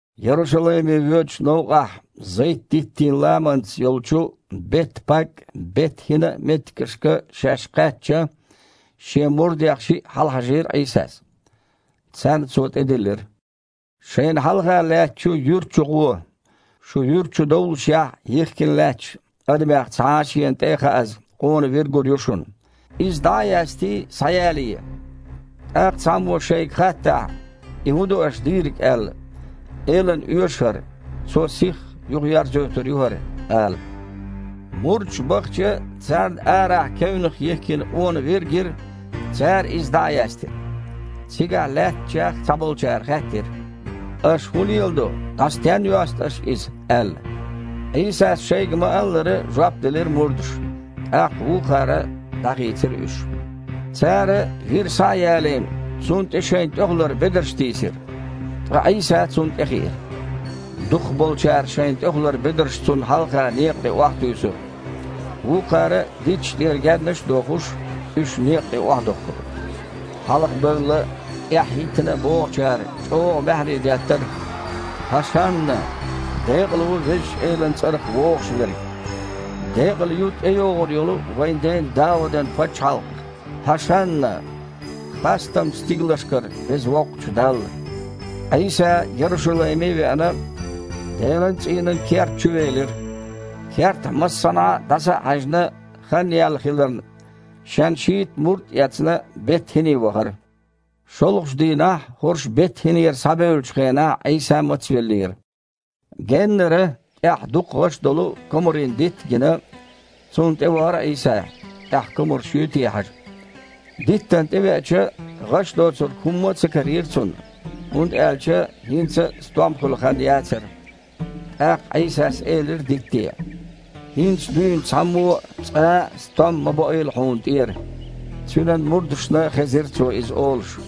Ярушалайме воьдучу новкъахь, Зайт-диттийн ламанца йолчу Бет-Паг а, Бет-ХІина а меттигашка шаьш кхаьчча, Шен мурдех шиъ хьалхахьажийра Іийсас. Царна Цо тІедиллира: «Шайна хьалха лаьттачу юьрта чу гІо. Шу юьрта чу довллушехь, йихкина лаьтташ, адамех цхьа а шена тІе а хааза, къона вир гур ю шуна, иза дІа а ястий, схьаялае. Ткъа цхьаммо шайга хаттахь: „И хІун ду аша дийриг?“ – аьлла, „Элана оьшу хІара, Цо сихха юхаерзайойтур ю хІара“, – ала». Мурдаш бахча, царна арахь кевнах йихкина къона вир а гира, цара иза дІа а яьстира. Цигахь лаьттачех цхьаболчара хаьттира: «Аша хІун леладо, дІа стенна йосту аша иза?» – аьлла. Іийсас шайга ма-аллара, жоп делира мурдаша, тІаккха вукхара дІахийцира уьш. Цара, вир схьа а ялийна, цунна тІе шайн тІехулара бедарш тийсира, ткъа Іийса цунна тІе хиира. Дукхахболчара шайн тІехулара бедарш Цунна хьалха некъа тІе охьатуьйсура, вукхара, дитташ тІера гаьннаш а дохуш, уьш некъа тІе охьадохкура. Хьалха бевлла а, тІаьхьа хІиттина а богІучара чІогІа маьхьарий деттара: «„ ХІашанна!“ „Декъала ву Везачу Элана цІарах вогІуш Верг!“ Декъала ю тІейогІур йолу вайн ден Даудан пачхьалкх! ХІашанна! Хастам стигалшкара Веза Воккхачу Далла». Іийса, Ярушалайме а веана, Делан цІийнан керта чу велира. Кертахь массанхьа а дІаса а хьаьжна, хан яьлла хиларна, Шен шийтта мурд а эцна, Бет-ХІине вахара. ШолгІачу дийнахь хІорш Бет-ХІинера схьабевллачу хенахь Іийса мацвеллера. Геннара, тІехь дукха гІаш долу комарийн дитт а гина, цунна тІе вахара Іийса, тІехь комарш юй те хьажа. Диттана тІевеача, гІаш доцург хІумма а ца карийра Цунна, хІунда аьлча хІинца а стом хуьлу хан яцара. ТІаккха Іийсас элира дитте: «ХІинца дуьйна цхьаммо а, цкъа а стом ма боийла хьуна тІера!» Цуьнан мурдашна хезира Цо иза олуш.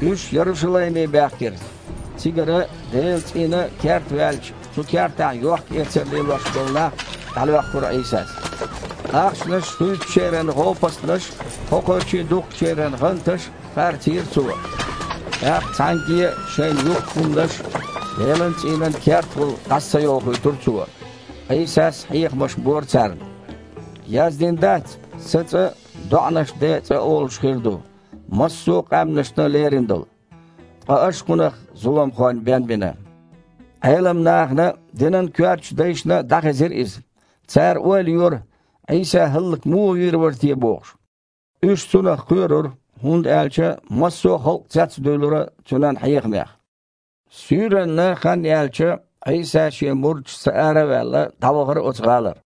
Уьш Ярушалайме баьхкира, цигара Делан цІийнан керта ваьлча, цу кертахь йохкаэцар лелош болу нах дІалоьхкура Іийсас. Ахчанаш хуьйцучеран гІопастанаш а, кхокхарчий духкучеран гІанташ а харцийра Цо. ТІаккха цхьаьнгге а шайн юхку хІуманаш Делан цІийнан кертахула дІаса ца йохуьйтура Цо. Іийсас хьехамаш бора царна: «Яздина дац: „Сан цІа доІанаш ден цІа олуш хир ду, массо а къаьмнашна лерина долу“? Ткъа аша кхунах „зуламхойн бен“ бина». Іелам нахана а, динан коьртачу дайшна а дІахезира иза. Цара ойла йора, Іийса хІаллак муха вийр вара те бохуш. Уьш Цунах кхоьрура, хІунда аьлча массо а халкъ цецдуьйлура Цуьнан хьехамех. Суьйранна, хан яьлча, Іийса, Шен мурдашца ара а ваьлла, дІавахара оцу гІалара.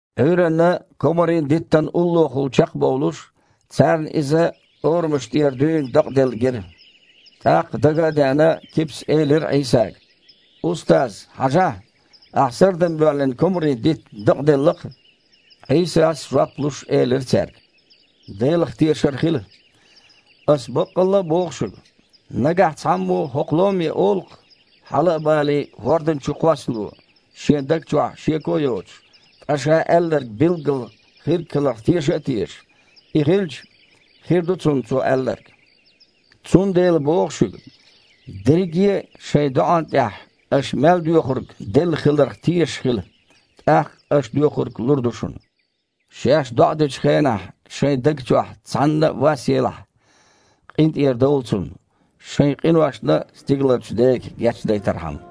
Іуьйранна, комарийн диттана уллохула чекхбовлуш, царна иза орамаш тІера дуьйна дакъаделла гира. ТІаккха, дага а деана, Кипас элира Іийсага: «Устаз! Хьажахь, Ахь сардам боьллина комарийн дитт дакъаделла-кх». Іийсас жоп луш, элира цаьрга: «Делах тешар хила! Аса баккъалла а боху шуьга: нагахь цхьаммо хІокху ломе олу-кх: „Хьала а балий, хІордана чу кхоссало“, – шен даг чохь шеко а йоцуш, ткъа ша аьлларг билггала хирг хиларх теша а тешаш и хилча, хир ду цунна цо аьлларг. Цундела боху шуьга: дерриге а шайн доІан тІехь аш мел доьхург делла хиларх тешаш хила – тІаккха аш доьхург лур ду шуна. Шаьш доІа дечу хенахь шайн даг чохь цхьанна вас елахь, къинтІера довла цунна, шайн къиношна а Стигаларчу Дега гечдайтархьама».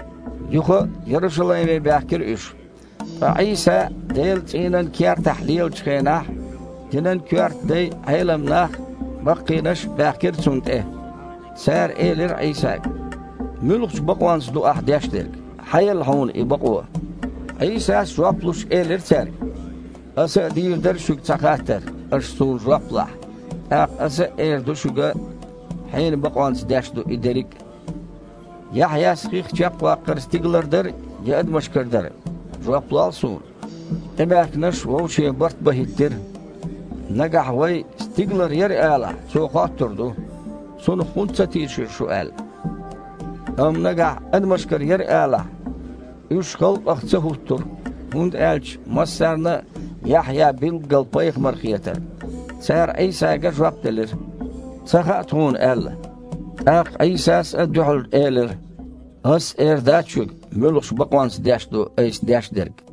Юха а Ярушалайме баьхкира уьш. Ткъа Іийса Делан цІийнан кертахь лелачу хенахь, динан коьрта дай а, Іелам нах а баккхийнаш а баьхкира Цунна тІе. Цара элира Іийсага: «Муьлхачу бакъонца ду Ахь деш дерг? Хьан елла Хьуна и бакъо?» Іийсас, жоп луш, элира цаьрга: «Аса а дийр дара шуьга цхьа хаттар, аш Суна жоп лахь, тІаккха Аса а эр ду шуьга, хьенан бакъонца деш ду и дерриг а. Яхьъяс хих чекхваккхар стигалара дара я адамашкара дара? – жоп лол Суна!» ТІебаьхкинарш вовше барт бан хІиттира: «Нагахь вай: „Стигалара яра“, алахь, Цо хоттур ду: „Цунах хІунда ца тийшира шу?“ – аьлла. Амма нагахь: „Адамашкара яра“, – алахь...» (Уьш халкъах ца хІуттура, хІунда аьлча массарна а Яхьъя билггала пайхамар хетара.) Цара Іийсага жоп делира: «Ца хаьа тхуна», – аьлла. ТІаккха Іийсас а дуьхьал элира: «Ас а эр дац шуьга, муьлхачу бакъонца деш ду Айса деш дерг».